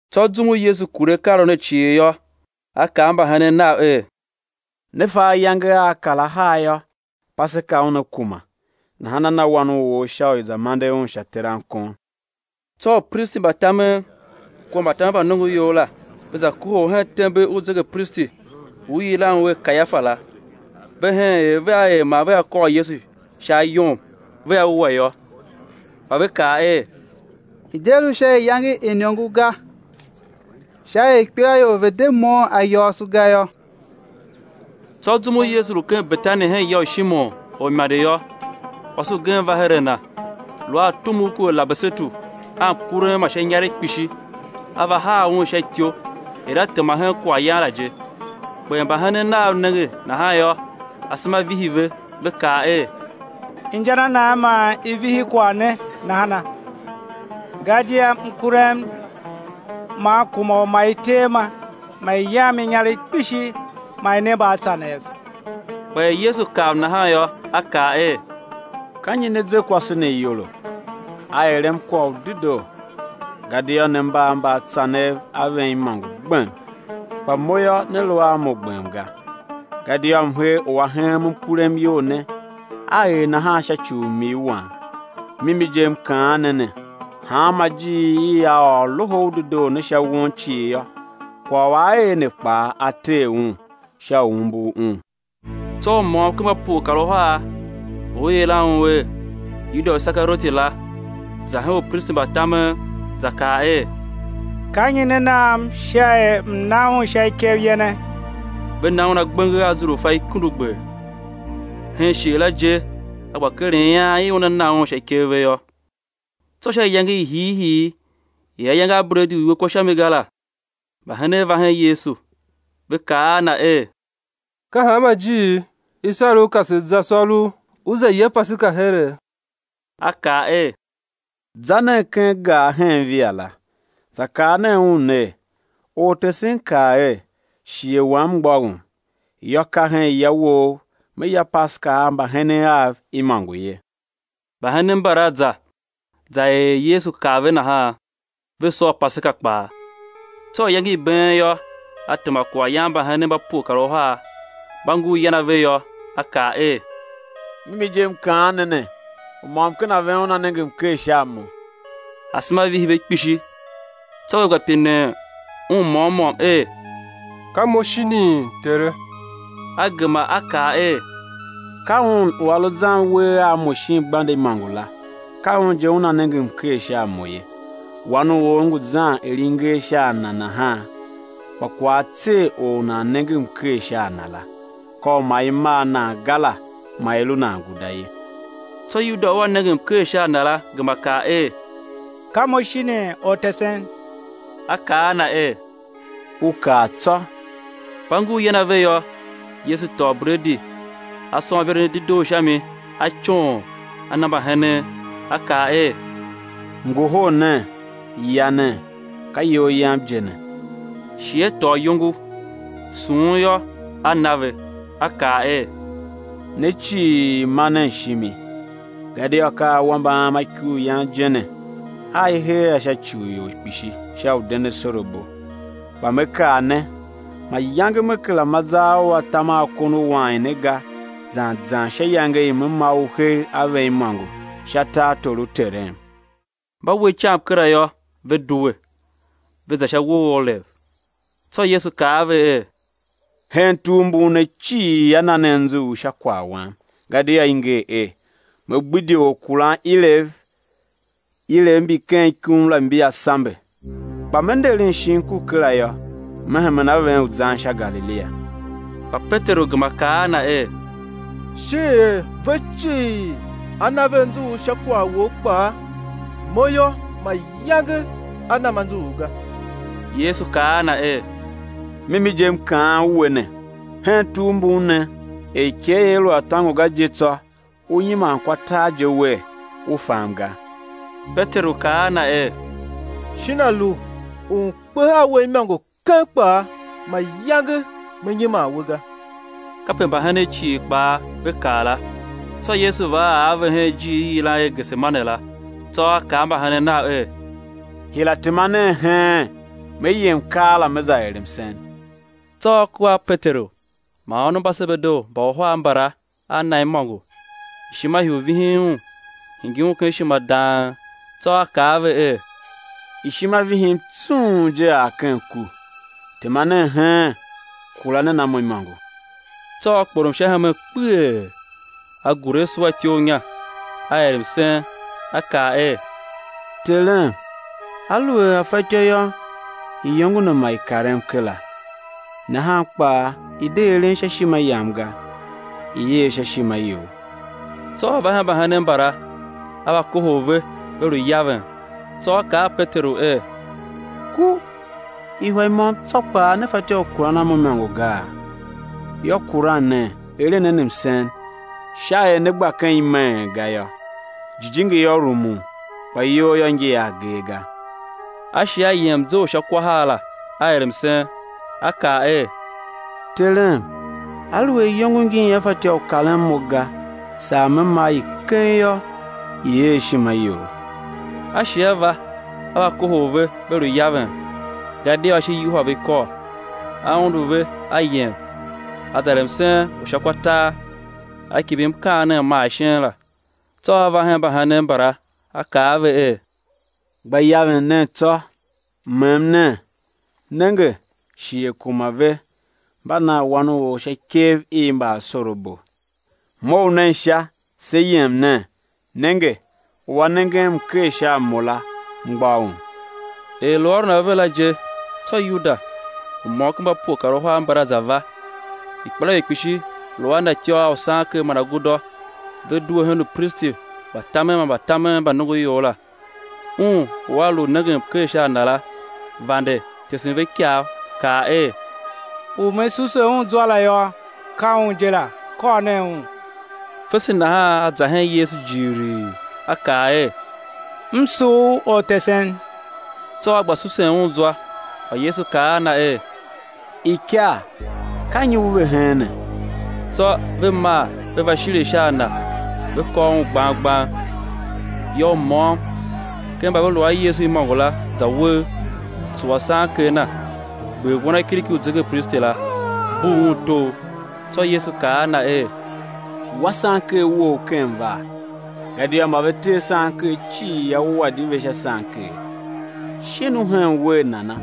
Tsô zum u Yesu kure akaaôron ne cii yô, A kaa a mbahenen Nav er: Ne fa ayange aa kar ahar yô, Paseka una kuma; nahan á na Wan u or sha u i̱ za mande Un sha terankon. Tsô upristi mba tamen kua mbatamen mba nongoior la, ve za kohol hen tembe u zegepristi u i yilan un er Kayafa la. Ve hen er vea er man vea kôr Yesu sha ayom, vea wua yô. Kpa ve kaa er: I̱ de lu sha iyange i iniongo ga, sha er ikpelaior ve̱ de moughon ayôôso ga yô. Tsô zum u Yesu lu ken Betani hen ya u Shimon, orimande yô, kwase ugen va her a Na, lu a tumugh ku alabasetu a mkurem ma sha inyaregh kpishi, a va haa Un sha ityou er A tema hen kwaghyan la je. Kpa er mbahenen Nav nenge nahan yô, asema vihi ve, ve kaa er: Inja na nan man i vihi kwagh ne nahana? Gadia mkurem man kuma u ma i tee ma, ma i yam inyaregh kpishi ma i ne mbaatsanev. Kpa er Yesu kav nahan yô, A kaa er: Ka nyi ne ze kwase ne iyolo? A erem kwagh u dedoo. Gadia ne mba a mbaatsanev a ven imôngo gbem; kpa Mo yô, né lu a Mo gbem ga. Gadia mhee u a heem mkurem iyol ne, a er nahan sha ci u m-ii Wam. Mimi je M kaan ne ne, hanma ijiir i á ôr Loho u Dedoo ne sha won cii yô, kwagh u a er ne kpaa á ter un, sha u umbur un. Tsô u môm ken mba pue kar uhar, u i yilan un er, Yuda u Isekarioti la, za hen upristi mba tamen za kaa er: Ka nyi né nam sha er m̱ na Un sha ikev yene? Ve na un agbenger a azurfa ikundugber. Hen shighe la je a gba keren ian i una na Un sha ikev ve yô. Tsô sha iyange i hiihii i ayange a bredi u i we kwa sha mi ga la, mbahenen va hen Yesu, ve kaa a Na er: Ka hanma ijiir i sar U ka se za sôr U, U za ya Paseka here? A kaa er: Za nen ken gar hen via la, za kaa nen un ner: Ortesen kaa er: Shighe Wam mgbôghom; yô, ka hen ya wou Me ya Paseka a mbahenen Av imôngo ye. Mbahenen mbala za, za er er Yesu kaa ve nahan. Ve sôr Paseka kpaa. Tsô iyange i been yô, A tema kwaghyan a mbahenen mba pue kar uhar. Mba ngur yan ave yô, A kaa er: Mimi je M kaan ne ne, u môm ken a ven una nenge mker sha a Mo. Asema vihi ve kpishi, tsô ve gba pinen Un môm môm er: Ka mo, shinii, Tere? A gema A kaa er: Ka un u a lu zan uwegh a Mo shin gbande imôngo la, ka un je una nenge mker sha a Mo ye. Wan u or ngu zan er i nger sha a Na nahan, kpa kwagh á tser or u nan nenge mker sha a Na la; ka u ma i mar nan ga la, ma i lu nan guda ye. Tsô Yuda u a nenge mker sha a Na la, gema pine er: Ka mo shinii, Ortesen? A kaa a na er: U kaa tsô. Mba ngur yan ave yô, Yesu tôô bredi A sôn iveren i dedoo sha mi, A coon, A na mbahenen, A kaa er: Ngohol nen, ya nen, ka iyol Yam je ne. Shi A tôô iyongo, sughun yô, A na ve, A kaa er: Ne cii ma nen shimi; gadia ka awambe Am a ikuryan je ne, a i hee a sha ci u ior kpishi sha u den asorabo. Kpa Me kaa ne, mayange Me kera ma zar u atam a kon u wain ne ga zan zan sha iyange i Me ma u hegh a ven imôngo sha tartor u Terem. Mba we icam kera yô, ve due, ve za sha uwo u Olev. Tsô Yesu kaa a ve er: Hen tugh mbun, ne cii á na ne anzughul sha kwagh Wam, gadia i nger er: Me gbidye orkuranilev, ilev mbi ken ikum la mbia sambe. Kpa Me nderen shin ku kera yô, Me hemen a ven u zan sha Galilia. Kpa Peteru gema kaa a Na er: Shin er ve cii á na ve anzughul sha kwagh Wou kpaa, mo yô, mayange á nam anzughul ga! Yesu kaa a na er: Mimi je M kaan we ne, hen tugh mbun ne, er ikegh ia lu a tôngo ga je tsô, ú nyiman kwa tar je wer, u fam ga. Peteru kaa a Na er: Shin a lu u m̱ kpe a We imôngo keng kpaa, mayange me nyiman We ga. Kape mbahenen cii kpaa ve kaa la. Tsô Yesu va ar a ve hen ijiir i i yilan i er Gesemane la, tsô A kaa a mbahenen Nav er: Hira tema nen heen, Me yem keela Me za er msen. Tsô A kua a Peteru man ônov mba Sebedeu mba uhar mbala a Na imôngo, ishima hii u vihin Un, hingir Un ken ishima dang. Tsô A kaa a ve er: Ishima vihin tsung je ar ken ku, tema nen heen, kura nen a Mo imôngo. Tsô A kporom sha hemen kpeghee, A gure a suwa ityough inya, A er msen, A kaa er: Terem, aluer a fatyô yô, iyongo ne ma i karem kera; nahan kpaa i̱ de eren sha ishima Yam ga, i̱ er sha ishima You. Tsô A va hen mbahenen mbala, A va kohol ve ve lu yaven; tsô A kaa a Peteru er: Ku! Ihwa i môm tsô kpaa ne fatyô u kuran a Mo imôngo gaa? Yô, kuran nen, eren nen msen sha er né gba ken imeen ga yô, jijingi yô, rumun, kpa iyol yô, ngi a agee ga. A shi A yem mze u sha kwa har la, A er msen, A kaa er: Terem, aluer iyongo ngin ia fatyô u karen Mo ga, saa Me ma i keng yô, i̱ er ishima You! A shi a va, A va kohol ve, ve lu yaven, gadia ashe yuhwa ve ikôl. A undu ve, A yem, A za er msen u sha kwa tar, A kimbir mkaanem ma ashen la. Tsô A va hen mbahenen mbala, A va kaa a ve er: Gba yaven nen tsô, mem nen, nenge, shighe kuma ve, mba nan Wan u or sha ikev i mbaasorabo. Mough nen sha, se yem nen; nenge, u a nengen mker sha a Mo la, mgbôghom. Er lu ôron ave la je, tsô Yuda, u môm ken mba pue kar uhar mbala za va, ikpelaior kpishi lu a na ijime imôngo a usanker man agudô; ve due hen upristi mba tamen man mbatamen mba nongoior la. Un u a lu nengen mker sha a Na la, vande tesen ve ikav kaa er: U me suse Un zwa la yô, ka Un je la, kôr nen Un. Fese nahan a za hen Yesu jighilii a kaa er: M sugh U, Ortesen! Tsô a gba susen Un zwa. Kpa Yesu kaa a na er: Ikar, ka nyi u ve heene? Tsô ve maa ve va shire sha a Na, ve kôr Un gbang gbang. Yô, u môm ken mba ve lu a Yesu imôngo la, za uwegh tsuwa sanker na, gber wanakiriki u zegepristi la, bugh un togh. Tsô Yesu kaa a na er: Wa sanker wou ken vaa, gadia mba ve tee sanker cii á wua di ve sha sanker. Shin u hen wer nana,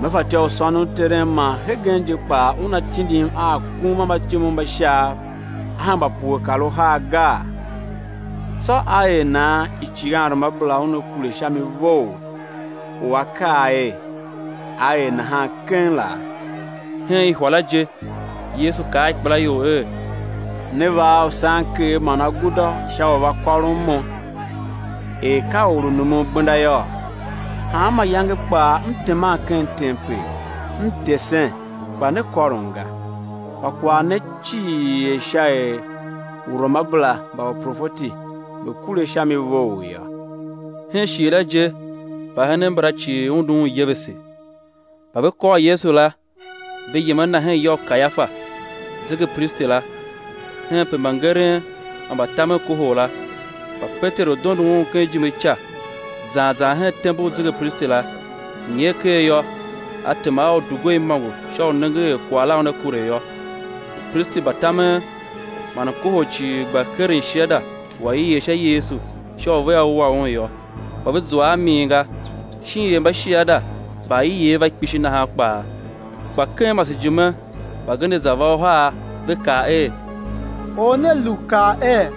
Me fatyô u sônon Terem man hegen je kpaa Una tindim a akum a mbatyomov mba Shaav, á hemba pue kar uhar, gaa? Tsô á er nan icighanruamabera una kure sha mi vough, u a kaa er, á er nahan keng, laa? Hen ihwa la je Yesu kaa a ikpelaior la er: Ne va a usanker man agudô sha u va kôron Mo, er ka or u numun gbenda yôô? Hanma iyange kpaa M teman ken tempel, M tesen, kpa ne kôrom ga. Kpa kwagh ne cii er sha er uruamabera mba uprofeti ve̱ kure sha mi vough yô. Hen shighe la je, mbahenen mbala cii undu Un yevese. Mba ve kôr Yesu la, ve yem a Na hen ya u Kayafa, zegepristi la, henpe mbangeren man mbatamen kohol la. Kpa Peteru dondo Un ken ijime ica, zan zan hen tembe u zegepristi la; nyer ker yô, a tema a udugwer imôngo sha u nengen er kwagh la una kure yô. Upristi mba tamen man mkohol cii gba keren shiada u aiegh sha Yesu sha u vea wua Un yô, kpa ve zua a min ga, shin er mbashiada mba aiev va kpishi nahan kpaa. Kpa ken masejime mbagenev za va uhar; ve kaa er: Or ne lu kaa er: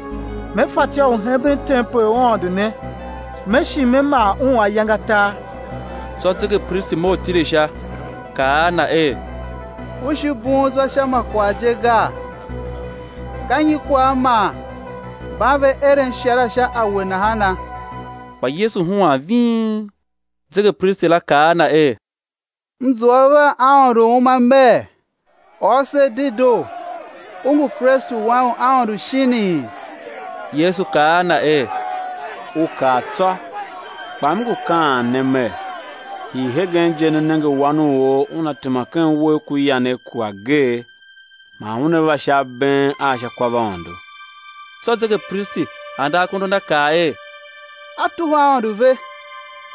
Me fatyô u hemben tempel u Aôndo ne, Me shi Me maa un ayange atar. Tsô zegepristi mough tile sha, kaa a Na er: U shi bughun zwa sha ma kwagh je gaa? Ka nyi kwagh man mban ve eren shiada sha a We nahana? Kpa Yesu huan ving. Zegepristi la kaa a Na er: M zua U vea Aôndo u uma mer: Ôr se dedoo, U ngu Kristu Wan u Aôndo shinii? Yesu kaa a na er: U kaa tsô! Kpa M ngu kaan ne Mer; hii hegen je né nenge Wan u or Una tema ken uwegh ku yanegh ku Ageegh, man Una va sha abeen a sha kwavaôndo. Tsô zegepristi ande akondo a na kaa er: A tuhwa Aôndo ve!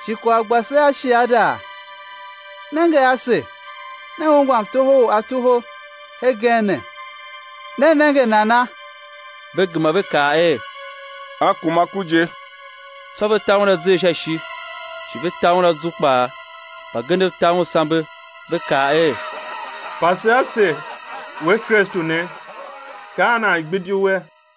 Shi kwagh gba se a shiada? Nenge ase, ne ungwa mtoho u A toho hegen ne. Ne nenge nana? Ve gema ve kaa er: A kuma ku je. Tsô ve ta Un azer sha ishi, shi ve ta Un azu kpaa; mbagenev ta Un sambe. Ve kaa er: Pase ase, We Kristu ne, ka an nan gbidi We?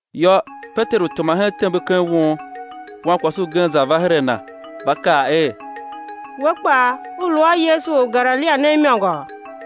Yô, Peteru tema hen tembe ken won. Wankwase ugen za va her a na, va kaa er: We kpaa, u lu a Yesu, Or u Galilia ne imôngo!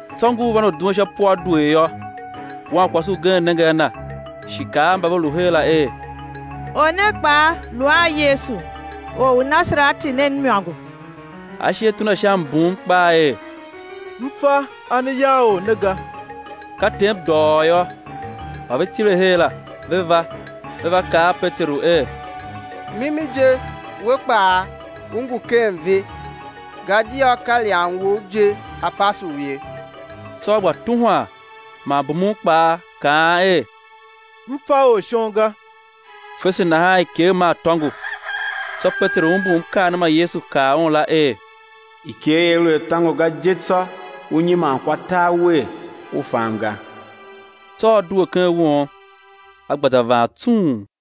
Tsô ngur van u duen sha puadwer yô, wankwase ugen nenge a na, shi kaa a mba ve lu her la er: Or ne kpaa lu a Yesu, Or u Nasareti ne imôngo. A shi a tuna sha mbum kpaa er: M fa a ne yagh Or ne ga! Ka tem dôghôô yô, mba ve tile her la, ve va, ve va kaa a Peteru er: Mimi je, we kpaa, u ngu u ken ve, gadia ka ilyam wou je a pase u ye. Tsô a gba tuhwan man bumun kpaa kaan er: M fa Or shon ga. Fese nahan ikegh maa tôngo. Tsô Peteru umbur mkaanem ma Yesu kaa un la er: Ikegh ia lu a tôngo ga je tsô ú nyiman kwa tar wer, u fam ga. Tsô a due ken won, a gba za vaan tsung.